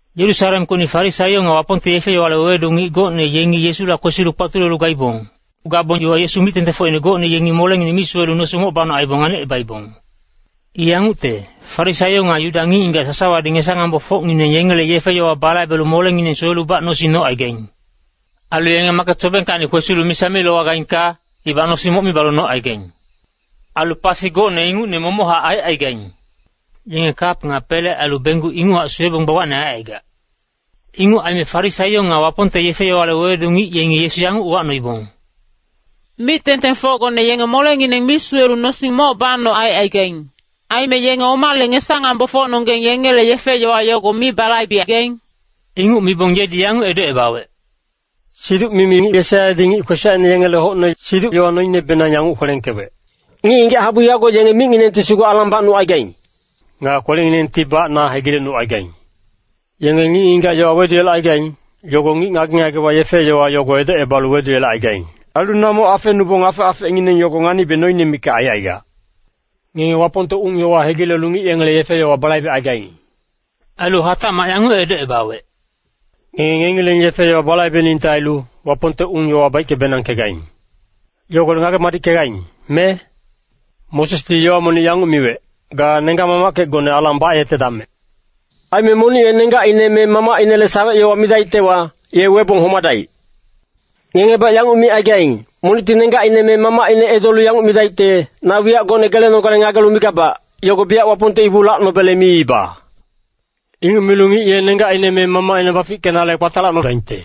Yerusalemkocni Farisaio nga Wapongte yefe-yowale wewedu ngic gocne yengi Yesula kwesilu kpatulelu gaibong. Gabong iwa Yesu mic-tengtengfocine gocne yengi molengineng mi suwelu nosing moc banoc aibong nganicebaibong. I yangucte, Farisaio nga Yuda ngic-ngigac sasawadi ngesa-ngambofocngineng yengele yefe-yowa balaibelu molengineng suwelubac nosing nocaigaing. Ailu yenge maket sobengkacni kwesilu misa mi lowagaingka, ibac nosing moc mi balu nocaigaing. Ailu pasi gocne ingucne momochac aicaigaing. Yenge kap nga pele ailu benggu inguchac suwebong gbagbacne aicaigac. Inguc aime Farisaio nga Wapongte yefe-yowale wewedu ngic yengi Yesu yanguc uwacnoibong, “Mic-tengtengfocgone yenge molengineng mi suwelu nosing moc banoc aicaigaing. Aime yenge omale ngesa-ngambofocnonggeng yengele yefe-yowa yogo mi balaibegaing?” Inguc mibong yedi yanguc edocebawec, “Siduc-mimi ngic Yesaiyadi ngic kwesacine ngengele hocne siduc-yowa noinebenang yanguc kwelengkewec, ‘Ngic-ngigac habu yago yenge micnginengti sugu alang bacnucaigaing. Nga kwelenginengtibac na hegilecnucaigaing. Yenge ngic-ngigac yowa weduyelecaigaing, yogo ngic ngage-ngagewa yefe-yowa yogo edocebalu weduyelecaigaing. Ailu na moc afenubong afec-afecngineng yogo nganibe noine mikac aicaigac.’ Ngenge Wapongte ung-yowa hegilelu ngic yengele yefe-yowa balaibecaigaing.” Ailu hatacmac yanguc edocebawec, “Ngenge ngengileng yefe-yowa balaibeningte ailu, Wapongte ung-yowa baicke-benangkegaing. Yogolec ngage-madickegaing, me? Mosesdi yowa monic yanguc miwec, ‘Ga nenggac-mamackecgone alang bayetedamec.’ Aime ‘Monic ye nenggacine me mamacinele sawec-yowa midaictewa, ye webong homadaic.’” “Ngengebac yanguc micaigaing, ‘Monicti nenggacine me mamacine edolu yanguc midaicte, “Na wiyac gocne gelenogale ngagelu migabac, yogo biyac Wapongte ibu lacnobele miiba.” ’ Inguc milu ngic ye nenggacine me mamacine bafickenale kpatalacnodaingte.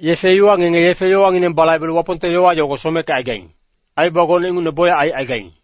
Yefe iwa ngenge yefe-yowangineng balaibelu Wapongte yowa yogo someckecaigaing, aibaba gocne ingucne bocyac aicaigaing.”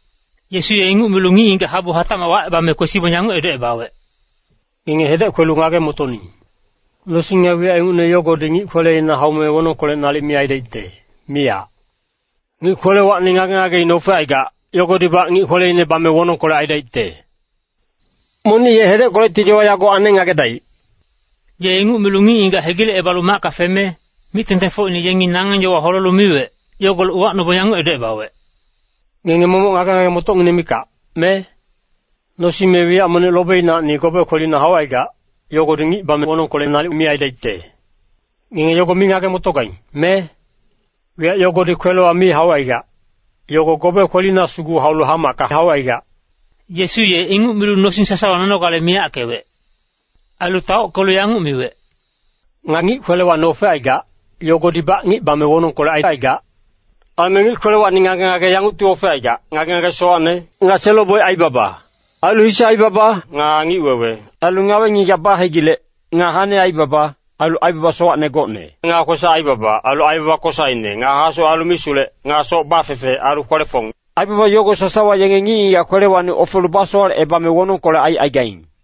Yesu ye inguc milu ngic-ngigac habu hatacmac wacebame kwesibong yanguc edocebawec, “Ngenge hedec kwelu ngage-motoning. Nosing nga wiyac ingucne yogodi ngic kweleina haume wonongkolec nalic mi aidaicte, miyac. Ngic kwelewacni ngage-ngageine ofecaigac, yogodibac ngic kweleine bame wonongkolec aidaicte. [Monic ye hedeckolecti yowa yago aneng ngagedaic.]” Ye inguc milu ngic-ngigac hegilecebalu macka feme, mic-tengtengfocine yengi nangeng yowa holelu miwec, yogolec uwacnobong yanguc edocebawec, “Ngenge momoc ngage-ngage-motocngineng mikac, me? Nosing me wiyac monic lobinacni gobe kwelina haucaigac, yogodi ngic bame wonongkolec nalic mi aidaicte. Ngenge yogo mi ngage-motogaing, me? Wiyac yogodi kwelewa mi haucaigac, yogo gobe kwelina sugu haulu hamacka haucaigac.” Yesu ye inguc milu nosing sasawa nonogale nalic miyackewec. Ailu taockelu yanguc miwec, “Nga ngic kwelewacni ofecaigac, yogodibac ngic bame wonongkolec aicaigac. Aime ngic-ngigac kwelewacni ngage-ngage yangucti ofecaigac. Ngage-ngage sowacne, nga selo-boic aibaba ailu hise aibaba, nga ngic-wewe. Ailu ngawe-ngigac bahegilec, nga hane aibaba, ailu aibaba sowacne gocne. Nga kwesac-aibaba, ailu aibaba kosaine, nga hasowac ailu misulec. Nga soc bafefe, ailu kwele-fong. Aibaba yogo sasawa yenge ngic-ngigac kwelewacni ofelu basowalecebame wonongkolec aicaigaing.”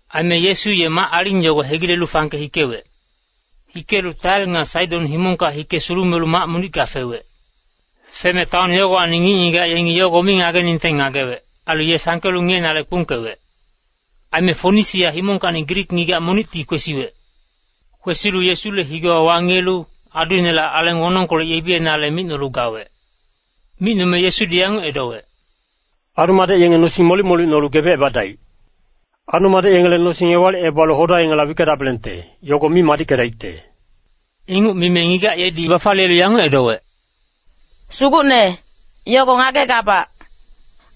Aime Yesu ye mac-aling yogo hegilelu fangke hikewec. Hikelu Tair nga Saidon himongka hike sulumelu mac monicka fewec. Feme taon yogowacni ngic-ngigac yengi yogo mi ngageningte ngagewec. Ailu ye sangkelu ngiyenale kpungkewec. Aime Fonisia himongkacni Grik ngigac monicti kwesiwec. Kwesilu Yesule higewa wangiyelu, aduinela aleng wonongkolec yebiyenale micnolu gawec. Micnome Yesudi yanguc edowec, “Adu-madec yenge nosing molic-molic nolu gebecebadaic. Adu-madec yengele nosing ewalicebalu hoda yengela wickedabelengte, yogo mi madickedaicte.” Inguc mime ngigac yedi bafaliyelu yanguc edowec, “Sugucne, yogo ngagegabac.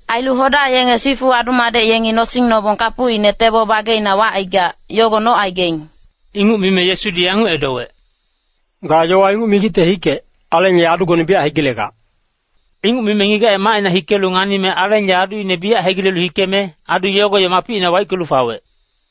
Ailu hoda yenge sifu adu-madec yengi nosing nobong kapucine tebo bageina wacaigac, yogo nocaigaing.” Inguc mime Yesudi yanguc edowec, “Ga yowa inguc migicte hikec, aleng ye adugone biyac hegilegac.” Inguc mime ngigac ye macina hikelu nganime aleng ye aduine biyac hegilelu hikeme, adu yogo ye mapicina waickelu fawec.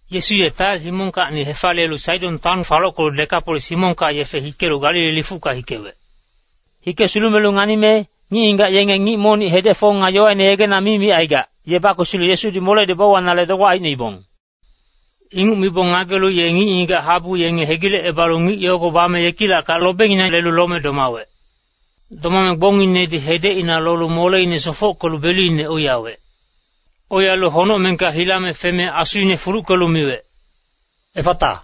Yesu ye Tair himongkacni hefaliyelu Saidon taon falockelu Dekapolis himongka yefe hikelu Galili lifucka hikewec. Hike sulumelu nganime, ngic-ngigac yenge ngic monic hedec-fong nga yowaine yegena mi micaigac, ye bakwesilu Yesudi moledi bauwanale dogbac aicnoibong. Inguc mibong ngagelu ye ngic-ngigac habu yenge hegilecebalu ngic yogo bame yekilackac lobenginang lelu lome domawec. Domame gbongnginedi hedecina lolu moleine sofockelu beluine oiyawec. Oiyalu honocmengka hilame feme asuine fuluckelu miwec, “Effata!”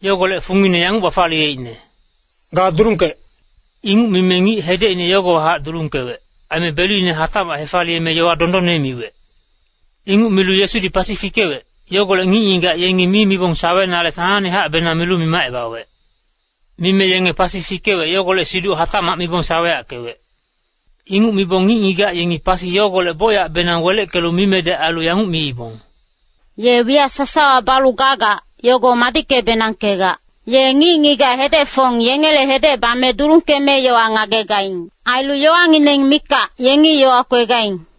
Yogolec fungine yanguc bafaliyeicne, “Ga dulungkec!” Inguc mime ngic hedecine yogowahac dulungkewec. Aime beluine hatacmac hefaliyeme yowa dondonne miwec. Inguc milu Yesudi pasi fikewec, yogolec ngic-ngigac yengi mi mibong sawenale sanangnehacbenang milu mimacebawec. Mime yenge pasi fikewec yogolec siduc hatacmac mibong saweyackewec. Inguc mibong ngic-ngigac yengi pasi yogolec bocyacbenang weleckelu mimedec ailu yanguc miibong, “Ye wiyac sasawa balu gagac, yogo madicke-benangkegac. Ye ngic-ngigac hedec-fong yengele hedec bame dulungkeme yowa ngagegaing. Ailu yowangineng mikac, yengi yowa kwegaing.”